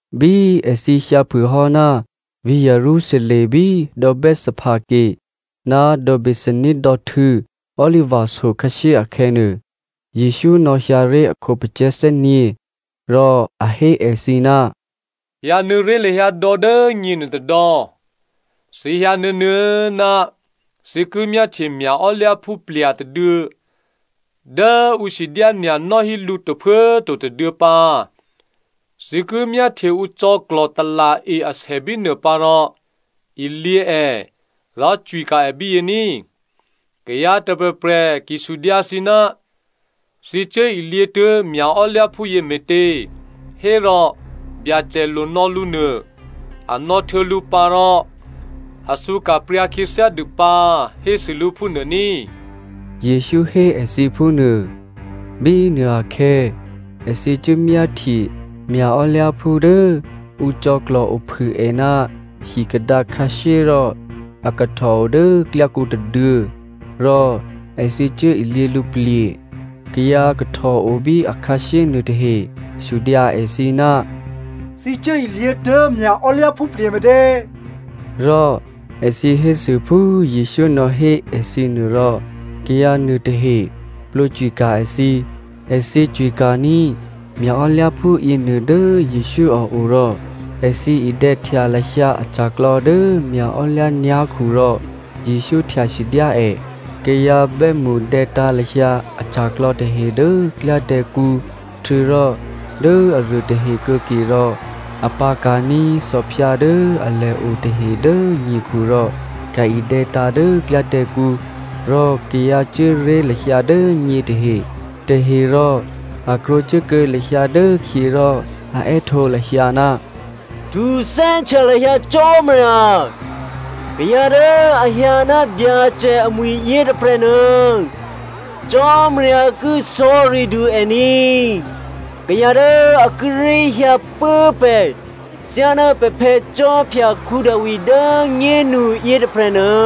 Bí èthǐ hyǎtuố̤phû hò́ ná vǐ̤ Jerusalem bí dò̌ Bethphage ná dò̌ Bethania dò̌htû̌ Oliva so khǎshyéakhè̌nuô, Jesǔ nò̌hyǎ ré̤ a khǒpacè̤̌ thè́nyě̤. Rò a hé èthǐ, “Hyǎnuô̌ ré̤ lahyǎ dò̌ dố nyěnuô tôdò̌, thǐ hyǎ nuô̌nuô̌ ná thǐ ki myáhtye mya̤ò́lyǎphú plya̤ tôduô̌ dố ǔ sidyánya̤ nò́hí lǔ tôphuố꤮ to tôduô̌ pǎ. Thǐ ki myáhtye ǔ cò̌klò̤ tala̤-e asè bínuô pǎ rò ilyě è rò cwika̤ è bíyě ní꤮. Kayǎ tôprè̤prè̤ ki sudyǎ thǐ, ‘Thǐ cuố ilyě tuố̤ mya̤ò́lyǎphúyě me̤tě?’ Hérò, ‘Byacè lo nò̌ lǔ nuô, a nò̌htuô̌ lǔ pǎ rò a thǔka̤pryǎ khyěthyá dû pǎ,’ hésû lǔ phúnuô ní꤮.” Jesǔ hé èthǐ phúnuô. Bínuô akhè̌ èthǐ cuốmyáhtye mya̤ò́lyǎphú dố ǔ cò̌klò̤ ophû è ná hikadǎ khǎshyé rò a kahtòo dố klyákǔ tôduô̌. Rò èthǐ cuốilyě lǔplye̤. Kayǎ kahtòo bí akhǎshyé nuôtahe sudyǎ èthǐ, “Thǐ cuốilyě tuố̤ mya̤ò́lyǎphú plye̤ me̤tě?” Rò èthǐ hésû phú Jesǔ nò̌hé èthǐ nuô rò kayǎ nuôtahe plwǒcwika̤ èthǐ. Èthǐ cwika̤ní̤ mya̤ò́lyǎphú yěnuô dố Jesǔ a o rò èthǐ idè̌htya lahyǎ aca̤klò̌ dố mya̤ò́lyǎ nyá̤khu rò Jesǔ htyasidyá è. Kayǎ bè́mṳ dè̌tǎ̤ lahyǎ aca̤klò̌ tahe dố klyádè̌kǔ htuô̌rò dố aruô tahe kuô̌ke rò a pǎ̤ka̤ní̤ thòphyǎ dố alèo tahe dố nyekhu rò ka̤-idè̌tǎ̤ dố klyádè̌kǔ. Rò kayǎ cuố ré̤ lahyǎ dố nyě tahe, tahe rò a krwǒcuốkuô̌ lahyǎ dốkhyě rò a è́htǒ lahyǎ, “Htuthè́htya lahyǎ Cò́marya!” “Kayǎ dố a hyǎ ná Byacè amwi̤ yětôprè̤nuô, Cò́marya ki sò̌ridû è ní!” “Kayǎ dố a kíré̤ hyǎ pố pè̤ thyáná pè̤phè̌ Khwí Davi dố꤮ nyénu yětôprè̤nuô,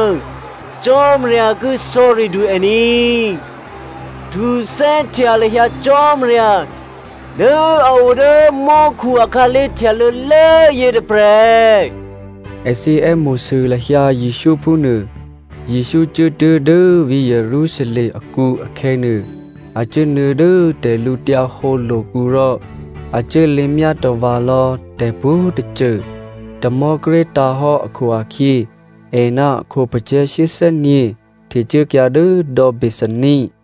Cò́marya ki sò̌ridû è ní!” “Htuthè́htya lahyǎ Cò́marya dố a o dố mò́khu akhǎlé̤ htyalô̌lố yětôprè̤!” Èthǐ è́mo̤sû lahyǎ Jesǔ phúnuô. Jesǔ cuốtuố̤ dố vǐ̤ Jerusalem akǔ akhè̌nuô, a cuốnuô̌ dố tè̤lǔhǒdu lo̤kǔ rò a cuốlěmyá tava̤lò̌ tè̤pwǒ̤tôcô. Tamò̤́ kíré̤ tǎ̤hò́ akhu-akhyě è ná a khǒpacè̤̌ shyéthè́nyě̤ htecuốkyǎ dố dò̌ Bethania.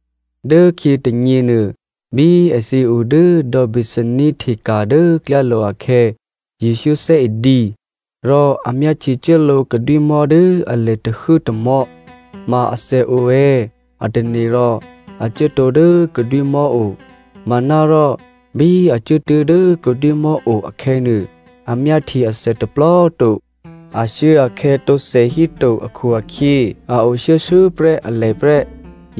Dốkhyě tônyěnuô bí èthǐ o dố dò̌ Bethania hteka̤ dố klyálo̤ akhè̌, Jesǔ thè́e dǐ. Rò a myáhtyecuốlǒ kadwímò̤́ dố alè tahuố tômò̤́. Ma athè o è̌ a tane̤ rò a cuốtǒ dố kadwímò̤́ o, manárò bí a cuốtuố̤ dố kadwímò̤́ o akhè̌nuô, a myáhtye athè tôplò꤮ to, ashuốakhè̌ tǒthè híto akhu-akhyě a o shuô̌shuô̌prè́ alè prè́.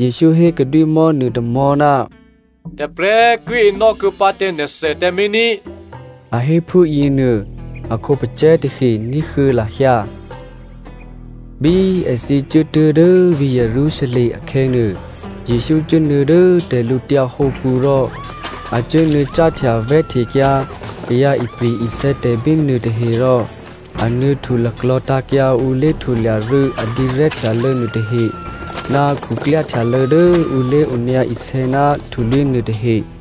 Jesǔ hé kadwímò̤́ nuôtômò̤́, “Tôprè̤꤮ ki enò́ kuô̌pǎ tǎ nè̤thè tǎmé̤ ní꤮” a hé phúyěnuô a khǒpacè̤̌ tahe ní̤huô̌ lahyǎ. Bí èthǐ cuốtuố̤ dố vǐ̤ Jerusalem akhè̌nuô, Jesǔ cuốnuô̌ dố tè̤lǔtyǎ hǒkǔ rò a cuốnuô̌ cáhtya vè̤́htekyǎ kayǎ ipri̤-isè̌tè̤ bínuô tahe rò a nuô̌htu laklò̤̌tǎ̤kyǎ ǔ lé̤htulya rû̌ a dǐrè̤́htyalô̌ nuôtahe ná khuklyáhtyalô̌ dố ǔ lé̤onyǎ isè̌ ná htulwí̤ nuôtahe.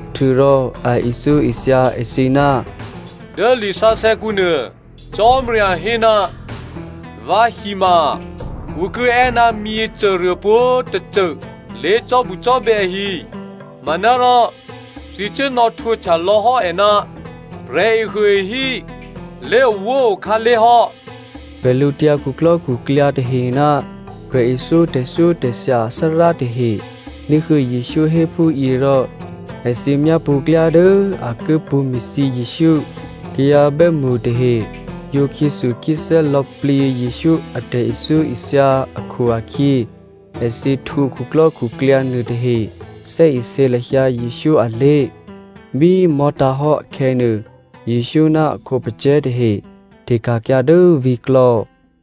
Htuô̌rò a ithyóithya èthǐ, “Dố lisǎsè̌kǔnuô, Cò́marya hé, ‘Vǎhi ma ǔ ki è́ ná myěcôruô pwǒ̤꤮ tôcô lé̤cò́bucò́bè̌ ahi’ “Manárò thǐ cuốnò̌ htwǒhtya lò̌hò́ è ná ‘Prè̤ehuôehí lé̤owóo akhǎlé̤ hò́.’” Bwídukhu tahe ná prè̤ithyó tè̤thyótè̤thya athárá tahe ní̤huô̌ Jesǔ hé phúyě rò èthǐ myápṳ̌ klyá dố a ki pṳ̌me̤thyě Jesǔ. Kayǎ bè́mṳ tahe yǒ khyéthukhyéthè́ lò̌plǐ Jesǔ a tè̤ithyóithya akhu-akhyě, èthǐ htwǒ khuklò́khuklyǎ nuôtahe thè́isě lahyǎ Jesǔ alé̤. Bí mò̤́tǎ̤ hò́ akhè̌nuô, Jesǔ ná a khǒpacè̤̌ tahe hteka̤kyǎ dố vǐ̤klò̌.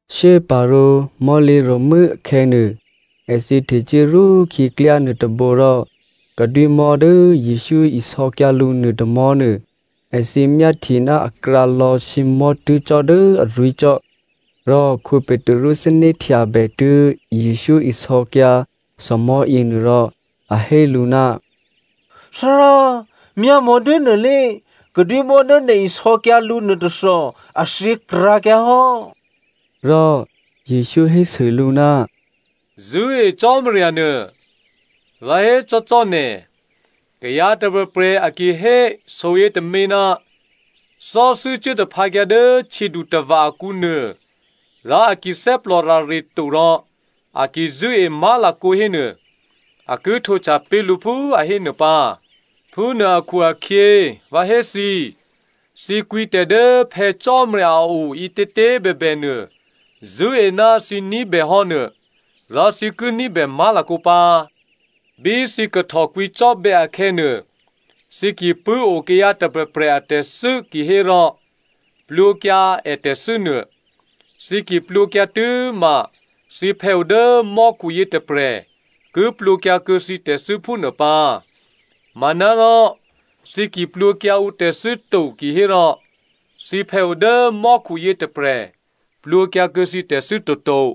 Shyéparǒ mò̤́lǐro̤mû́ akhè̌nuô, èthǐ htecuố rwókhyě klyá nuôtôbǒ rò kadwímò̤́ dố Jesǔ isò̌kyǎ lǔ nuô tômò̤́nuô èthǐ myáhtye ná akrǎlò̌ sǐmò̤́ tuố̤ cò́ dố arwí̤ cò́. Rò Petru thè́né̤htyabè tuố̤ Jesǔ isò̌kyǎ thòmò̤́ yěnuô rò a hé lǔ, “Thárá꤮ myámò̌ dốnuô lé, kadwímò̤́ dố nè̤ isò̌kyǎ lǔ nuôtôthò a thyěkrǎkyǎ hò́.” Rò Jesǔ hésû lǔ, “Zṳ̂́e Cò́marya nuô. Vǎ hécò́ cò́ nè̤, kayǎ tôprè̤prè̤ a ki hé soyětômě, ‘Thò́thû́ cuố taphǎkyǎ dố htyědutava̤ akǔnuô,’ rò a ki thè́plòrare to rò a ki zṳ̂́e má̤lakǒ hénuô, a ki htwǒhtya pé̤ lǔ phú a hé nuô pǎ. Phúnuô akhu-akhyě vǎ hé thǐ, thǐ kwǐtè̤ dố Phè̌ Cò́marya a o ǐtětě꤮ bèbènuô zṳ̂́e ná thǐ ní̤bèhò́ nuô, rò thǐ ki ní̤bè má̤lakǒ pǎ. Bí thǐ kahtò kwǐcò́bè̌ akhè̌nuô, thǐ ki pṳ̂́o kayǎ tôprè̤prè̤ atè̤thû́ kihérò plwǒkyǎ ètè̤thû́nuô. Thǐ ki plwǒkyǎ tû́ma thǐphè̌ o dố mò́khu yětôprè̤ ki plwǒkyǎkuô̌ thǐ tè̤thû́ phúnuô pǎ.” (“Manárò thǐ ki plwǒkyǎ ǔtè̤thû́ to kihérò, thǐphè̌ o dố mò́khu yětôprè̤ plwǒkyǎkuô̌ thǐ tè̤thû́ toto.”)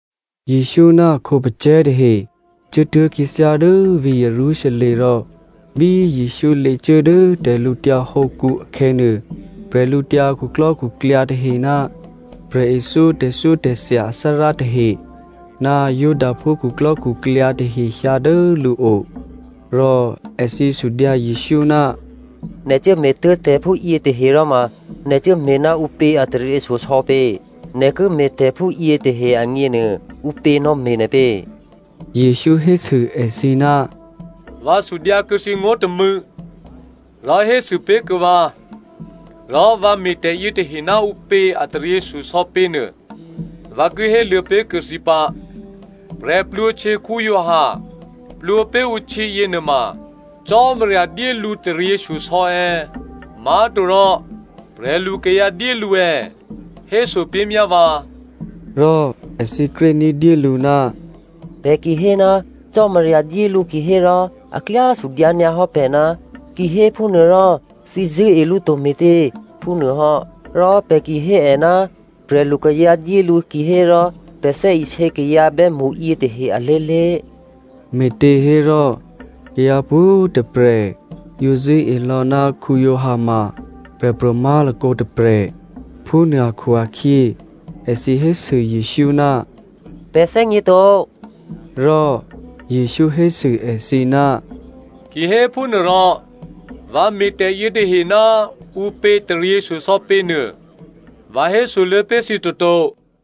Jesǔ ná a khǒpacè̤̌ tahe cuốtuố̤ khyěthyá dố vǐ̤ Jerusalem rò bí Jesǔ lěcuố dố tè̤lǔtyǎ hǒkǔ akhè̌nuô, bwídukhu tahe ná prè̤ithyó tè̤thyótè̤thya athárá tahe, ná Judaphú khuklò́khuklyǎ tahe hyǎ dố lǔo, rò èthǐ sudyǎ Jesǔ, “Nè̤ cuốme̤tuố̤ tè̤phúyě tahe ròma nè̤ cuốme̤ ná ǔpě a taryěshyosò̌ pě? Nè̤ ki me̤tè̤ phúyětahe agněnuô ǔpě nò̌me̤ nè̤ pě?” Jesǔ hésû èthǐ, “Vǎ sudyǎ kuô̌ thǐ ngó̤ tômû̌, rò hésû pé̤ kuô̌ vǎ, rò vǎ me̤ tè̤yětahe ná ǔpě a taryěshyosò̌ pěnuô vǎ ki héluô̌ pé̤kuô̌ thǐ pǎ. Giovanni Baptista plwǒ pé̤ ǔ htyě yěnuôma Cò́marya dyé lǔ taryěshyosò̌ è̌? Má̤torò prè̤lukayǎ dyé lǔ è̌? Héso pé̤ myá vǎ.” Rò èthǐ kré ní̤dyélǔ, “Pè̤ ki hé, ‘Cò́marya dyé lǔ’ kihérò, a klyá sudyǎ nyǎ hò́ pè̤, ‘Kihéphúnuôrò thǐ zṳ̂́e lǔ to me̤tě?’ Phúnuô hò́. Rò pè̤ ki hé è, ‘Prè̤lukayǎ dyé lǔ’ kihérò, pè̤ thè́isě kayǎ bè́mṳ yětahe alé̤lé̤.” (Me̤těhérò kayǎ pwǒ̤꤮ tôprè̤ yǒ zṳ̂́e lò̌ ná Giovanni ma prè̤pro̤ má̤lakǒ tôprè̤.) Phúnuô akhu-akhyě èthǐ hésû Jesǔ, “Pè̤ thè́gněto.” Rò Jesǔ hésû èthǐ, “Kihéphúnuôrò vǎ me̤tè̤ yětahe ná ǔpě taryěshyosò̌ pě nuô vǎ hésoluô̌ pé̤ thǐ toto.”